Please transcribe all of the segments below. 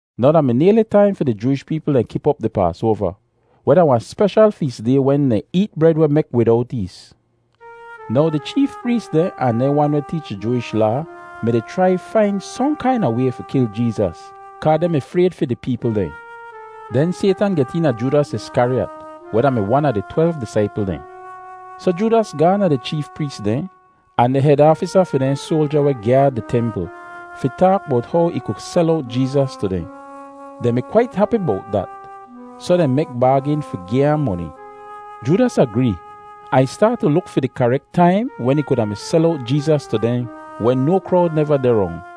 Now da mi nayli taim fi di Jooish peepl dehn kip op di Paasoava, weh da wahn speshal fees day wen dehn eet bred weh mek widowt ees. Now di cheef prees dehn ahn dehn wan weh teech di Jooish Laa mi-di chrai fain sohn kaina way fi kil Jeezas kaa dehn mi frayd fi di peepl dehn. Den Saytan get eena Joodas Iskariyat, weh da-mi wan a di twelv disaipl dehn. Soh Joodas gaahn da di cheef prees dehn ahn di hed aafisa fi dehn soalja weh gyaad di templ fi taak bowt how ih ku sel owt Jeezas tu dehn. Dehn mi kwait hapi bowt dat, soh dehn mek baagin fi gi ahn moni. Joodas agree, ahn ih staat tu luk fi di karek taim wen ih kuda mi sel owt Jeezas tu dehn wen no krowd neva deh rong.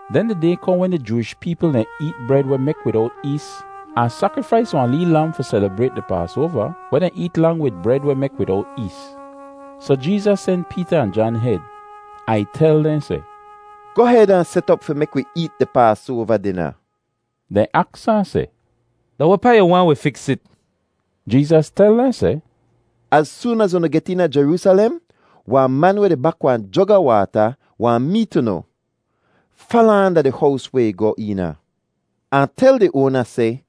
Den di day kohn wen di Jooish peepl dehn eet bred weh mek widowt ees ahn sakrifais wahn lee lam fi selibrayt di Paasoava, weh dehn eet lang wid bred weh mek widowt ees. Soh Jeezas sen Peeta ahn Jan hed, ahn ih tel dehn seh, “Goh hed ahn set op fi mek wi eet di Paasoava dina.” Dehn aks ahn seh, “Da wehpaa yu waahn wi fiks it?” Jeezas tel dehn seh, “Az soon az unu get eena Jeroosalem, wahn man weh di bak wahn jog a waata wahn meet unu. Fala ahn da di hows weh ih goh eena, ahn tel di oana seh,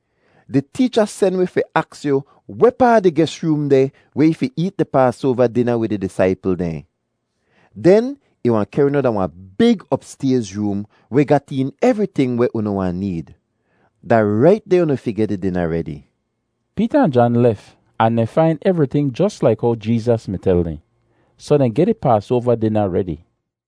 ‘Di teecha sen wi fi aks yu wehpaa di ges room deh weh ih fi eet di Paasoava dina wid ih disaipl dehn.’ Den ih wahn kehr unu da wahn big opstayz room weh gat een evriting weh unu wahn need. Da rait deh unu fi geh di dina redi.” Peeta ahn Jan lef ahn dehn fain evriting jos laik how Jeezas mi tel dehn. Soh dehn geh di Paasoava dina redi.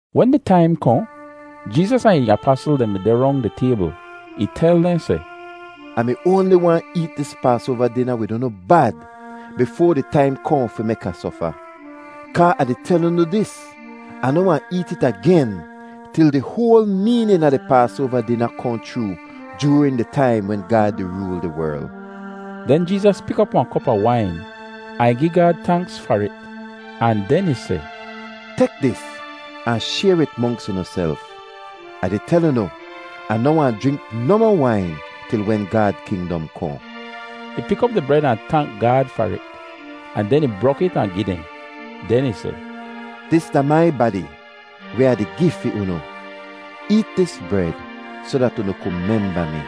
Wen di taim kohn, Jeezas ahn ih apasl dehn mi deh rong di taybl. Ih tel dehn seh, “Ah mi oanli waahn eet dis Paasoava dina wid unu bad, bifoa di taim kohn fi mek Ah sofa. Kaa Ah di tel unu dis, Ah noh wahn eet it agen til di hoal meenin a di Paasoava dina kohn chroo joorin di taim wen Gaad di rool di werl.” Den Jeezas pik op wahn kop a wain, ahn ih gi Gaad tanks far it, ahn den ih seh, “Tek dis ahn shayr it monks unuself. Ah di tel unu, Ah noh wahn jrink nohmoh wain til wen Gaad kingdom kohn.” Ih pik op di bred ahn tank Gaad far it, ahn den ih brok it ahn gi dehn. Den ih seh, “Dis da mai badi weh Ah di gi fi unu; eet dis bred soh dat unu ku memba mi.”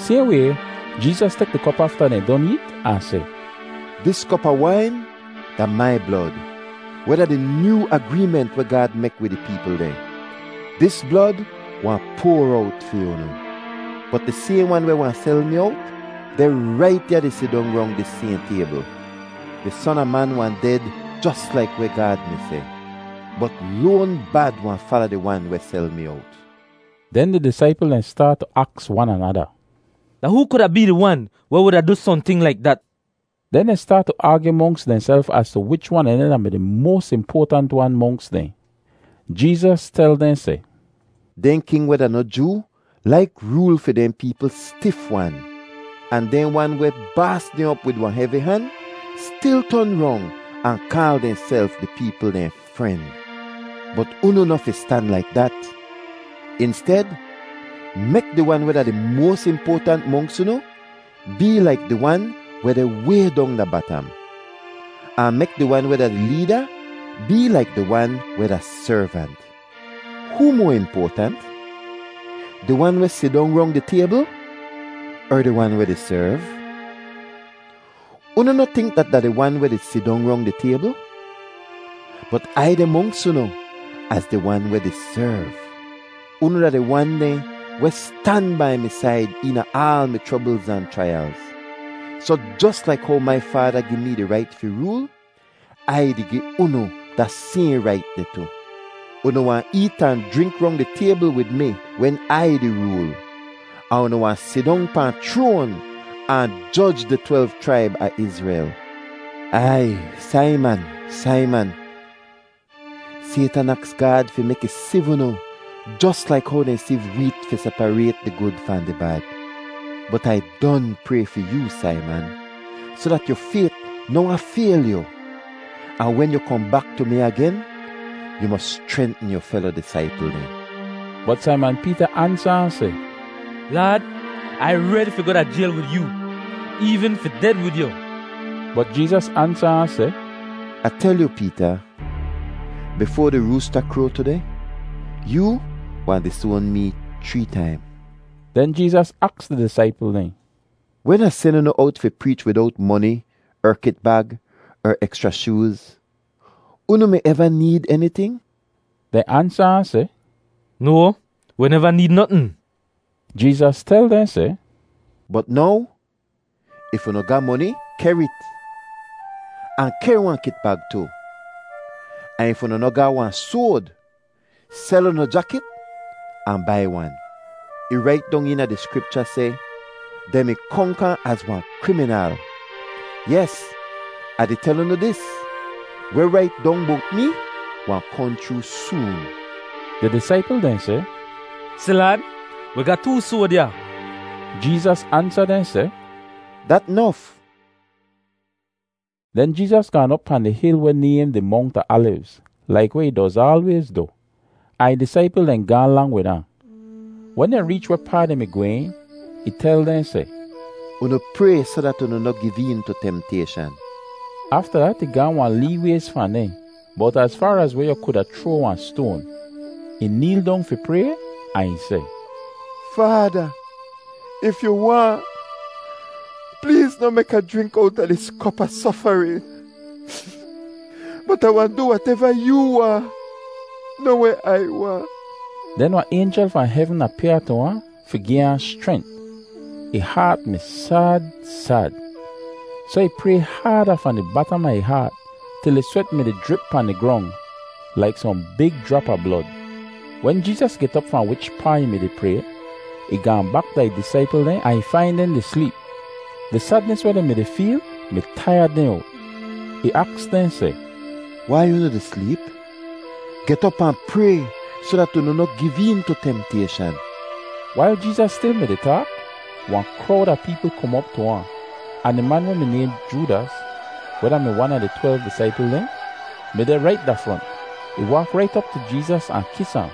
Sayhn way, Jeezas tek di kop afta dehn don eet ahn seh, “Dis kop a wain da mai blod, weh da di nyoo agreement weh Gaad mek wid ih peepl dehn. Dis blod wahn poar owt fi unu. “Bot di sayhn wan weh wahn sel mi owt deh rait ya di sidong rong dis sayhn taybl. Di Son a Man wahn ded jos laik weh Gaad mi seh. Bot loan bad wahn fala di wan weh sel mi owt.” Den di disaipl dehn staat tu aks wan anada, “Da hoo kuda bee di wan weh wuda du sohnting laik dat?” Den dehn staat tu aagyu monks dehnself az tu wich wan a dehn da-mi di moas impoatant wan monks dehn. Jeezas tel dehn seh, “Dehn king weh da noh Joo laik rool fi dehn peepl stif-wan, ahn dehn wan weh baas dehn op wid wahn hevi han stil ton rong ahn kaal dehnself di peepl dehn ‘fren.’ Bot unu noh fi stan laik dat. Insted, mek di wan weh da di moas impoatant monks unu bee laik di wan weh deh way dong da batam, ahn mek di wan weh da di leeda bee laik di wan weh da servant. Hoo moa impoatant, di wan weh sidong rong di taybl, er di wan weh di serv? Unu noh tink dat da di wan weh di sidong rong di taybl? Bot Ai deh monks unu az di Wan weh di serv. “Unu da di wan dehn weh stan bai mi said eena aal mi chroblz ahn chraiyalz, soh jos laik how mai Faada gi mee di rait fi rool, Ai di gi unu da sayhn rait deh tu. Unu wahn eet ahn jrink rong di taybl wid mi wen Ai di rool, ahn unu wahn sidong pahn chroan ahn joj di twelv chraib a Izrel. “Aiy, Saiman, Saiman, Saytan aks Gaad fi mek ih siv unu jos laik how dehn siv weet fi separayt di gud fahn di bad. Bot Ai don pray fi yoo, Saiman, soh dat yu fayt noh wahn fayl yu. Ahn wen yu kohn bak tu mi agen, yu mos schrentn yu felo disaipl dehn.” Bot Saiman Peeta ansa ahn seh, “Laad, Ai redi fi goh da jayl wid yoo, eevn fi ded wid yu.” Bot Jeezas ansa ahn seh, “Ah tel yu, Peeta, bifoa di roosta kroa tudeh, yoo wahn disoan mee chree taim.” Den Jeezas aks di disaipl dehn, “Wen Ah sen unu owt fi preech widowt moni er kitbag er ekschra shooz, unu mi eva need eniting?” Dehn ansa ahn seh, “No, wi neva need notn.” Jeezas tel dehn seh, “Bot now, if unu ga moni, kehr it, ahn kehr wahn kitbag tu. Ahn if unu noh ga wahn soad, sel unu jakit ahn bai wan. Ih rait dong eena di Skripcha seh, ‘Dehn mi konk ahn az wahn kriminal.’ Yes, Ah di tel unu dis, weh rait dong bowt mee wahn kohn chroo soon.” Di disaipl dehn seh, “Si Laad, wi ga too soad ya.” Jeezas ansa dehn seh, “Dat nof.” Den Jeezas gaan op pahn di hil weh nayhn di Mongt a Alivz laik weh ih doz aalwayz du, ahn ih disaipl dehn gaahn lang wid ahn. Wen dehn reech wehpaa dehn mi gwehn, ih tel dehn seh, “Unu pray soh dat unu noh giv een tu temtayshan.” Afta dat ih gaahn wahn lee wayz fahn dehn, bowt az faar az weh yu kuda chroa wahn stoan. Ih neel dong fi pray, ahn ih seh, “Faada, if yu waahn, pleez noh mek Ah jrink owta dis kop a sofarin. Bot Ai wahn du wateva yoo waahn, noh weh Ai waahn.” [Den wahn aynjel fahn hevn apyaa tu ahn fi gi ahn schrent. Ih haat mi sad sad, soh ih pray haada fahn di batam a ih haat til ih swet mi-di jrip pahn di grong, laik sohn big jrap a blod.] Wen Jeezas get op fahn wichpaa ih mi-di pray, ih gaahn bak da ih disaipl dehn ahn ih fain dehn di sleep—di sadnis weh dehn mi-di feel mi taiyad dehn owt. Ih aks dehn seh, “Wai unu di sleep? Get op ahn pray soh dat unu noh giv een tu temtayshan.” Wail Jeezas stil mi-di taak, wahn krowd a peepl kom op tu ahn, ahn di man weh mi nayhn Joodas, weh da-mi wan a di twelv disaipl dehn, mi deh rait da front. Ih waak rait op tu Jeezas ahn kis ahn.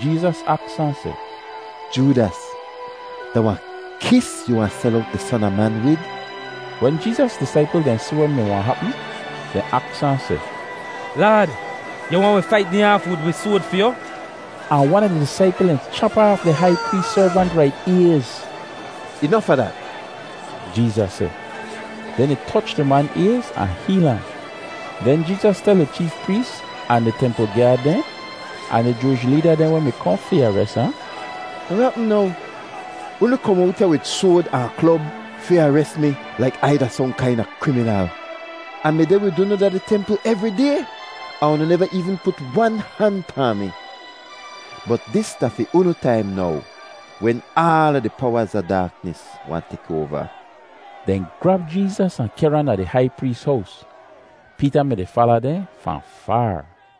Jeezas aks ahn seh, “Joodas, da wahn kis yu wahn sel owt di Son a Man wid?” Wen Jeezas disaipl dehn si weh mi wahn hapm, dehn aks ahn seh, “Laad, yu waahn wi fait dehn aaf wid wi soad fi yu?” Ahn wan a di disaipl dehn chap aaf di hai prees servant rait ayz! “Inof a dat!” Jeezas seh. Den ih toch di man ayz ahn heel ahn. Den Jeezas tel di cheef prees ahn di templ gyaad dehn, ahn di Jooish leeda dehn weh mi kohn fi ares ahn, “Da weh hapm now? Unu kom owt ya wid soad ahn klob fi ares mi laik Ai da sohn kaina kriminal. Ah mi deh wid unu da di templ evri day ahn unu neva eevn put wan han pahn mi. Bot dis da fi unu taim now, wen aala di powaz a daaknis wahn tek oava.” Dehn grab Jeezas ahn kehr ahn da di hai prees hows. Peeta mi-di fala dehn fahn faar.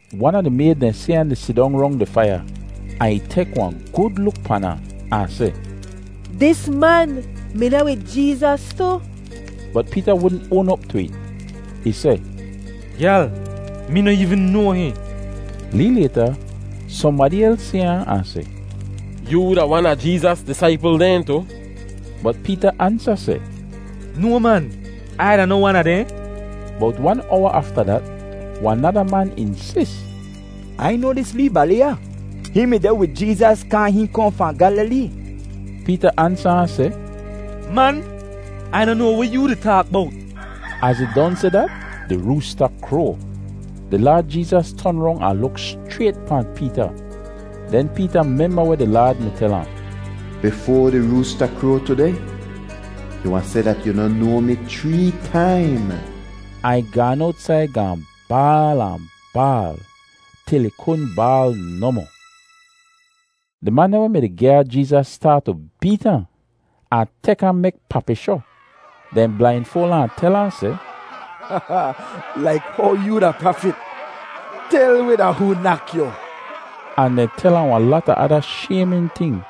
Wan a di mayd dehn si ahn di sidong rong di faiya, ahn ih tek wahn gud luk pan ahn, ahn seh, “Dis man mi deh wid Jeezas tu!” Bot Peeta wudn oan op tu it. Ih seh, “Gyal, mee noh eevn noa hihn.” Lee layta, sohnbadi els si ahn, ahn seh, “Yoo da wan a Jeezas disaipl dehn tu.” Bot Peeta ansa seh, “No, man. Ai da noh wan a dehn.” Bowt wan owa afta dat, wahn nada man insis, “Ai noa dis lee bali ya. Hihn mi deh wid Jeezas kaa hihn kohn fahn Gyalilee.” Peeta ansa ahn seh, “Man, Ai noh noa weh yoo di taak bowt!” Az ih don seh dat, di roosta kroa. Di Laad Jeezas ton rong ahn luk schrayt pahn Peeta. Den Peeta memba weh di Laad mi tel ahn: “Bifoa di roosta kroa tudeh, yu wahn seh dat yu noh noa mi chree taim.” Ahn ih gaan owtsaid gaahn baal ahn baal til ih kudn baal nohmoh. Di man dehn weh mi-di gyaad Jeezas staat tu beet ahn, ahn tek ahn mek papishoh. Dehn blainfoal ahn, ahn tel ahn seh, “Laik how yoo da prafit, tel wi da hoo nak yu.” Ahn dehn tel ahn wahn lata ada shaymin ting.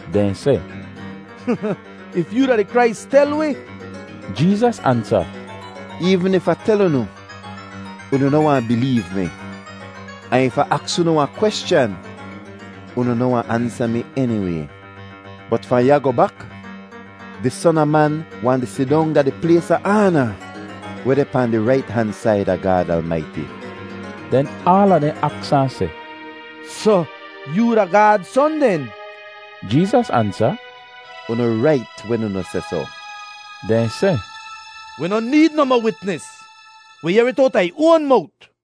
Dehn seh, “If yoo da di Krais, tel wi.” Jeezas ansa, “Eevn if Ah tel unu, unu noh wahn bileev mi. Ahn if Ah aks unu wahn kweschan, unu noh wahn ansa mi eniway. Bot fahn ya goh bak, di Son a Man wahn di sidong da di plays a aana, weh deh pahn di rait han said a Gaad Almaiti.” Den aala dehn aks ahn seh, “Soh yoo da Gaad Son den?” Jeezas ansa, “Unu rait wen unu seh soh.” Dehn seh, “Wi noh need nohmoh witnis. Wi yehr it owta ih oan mowt.”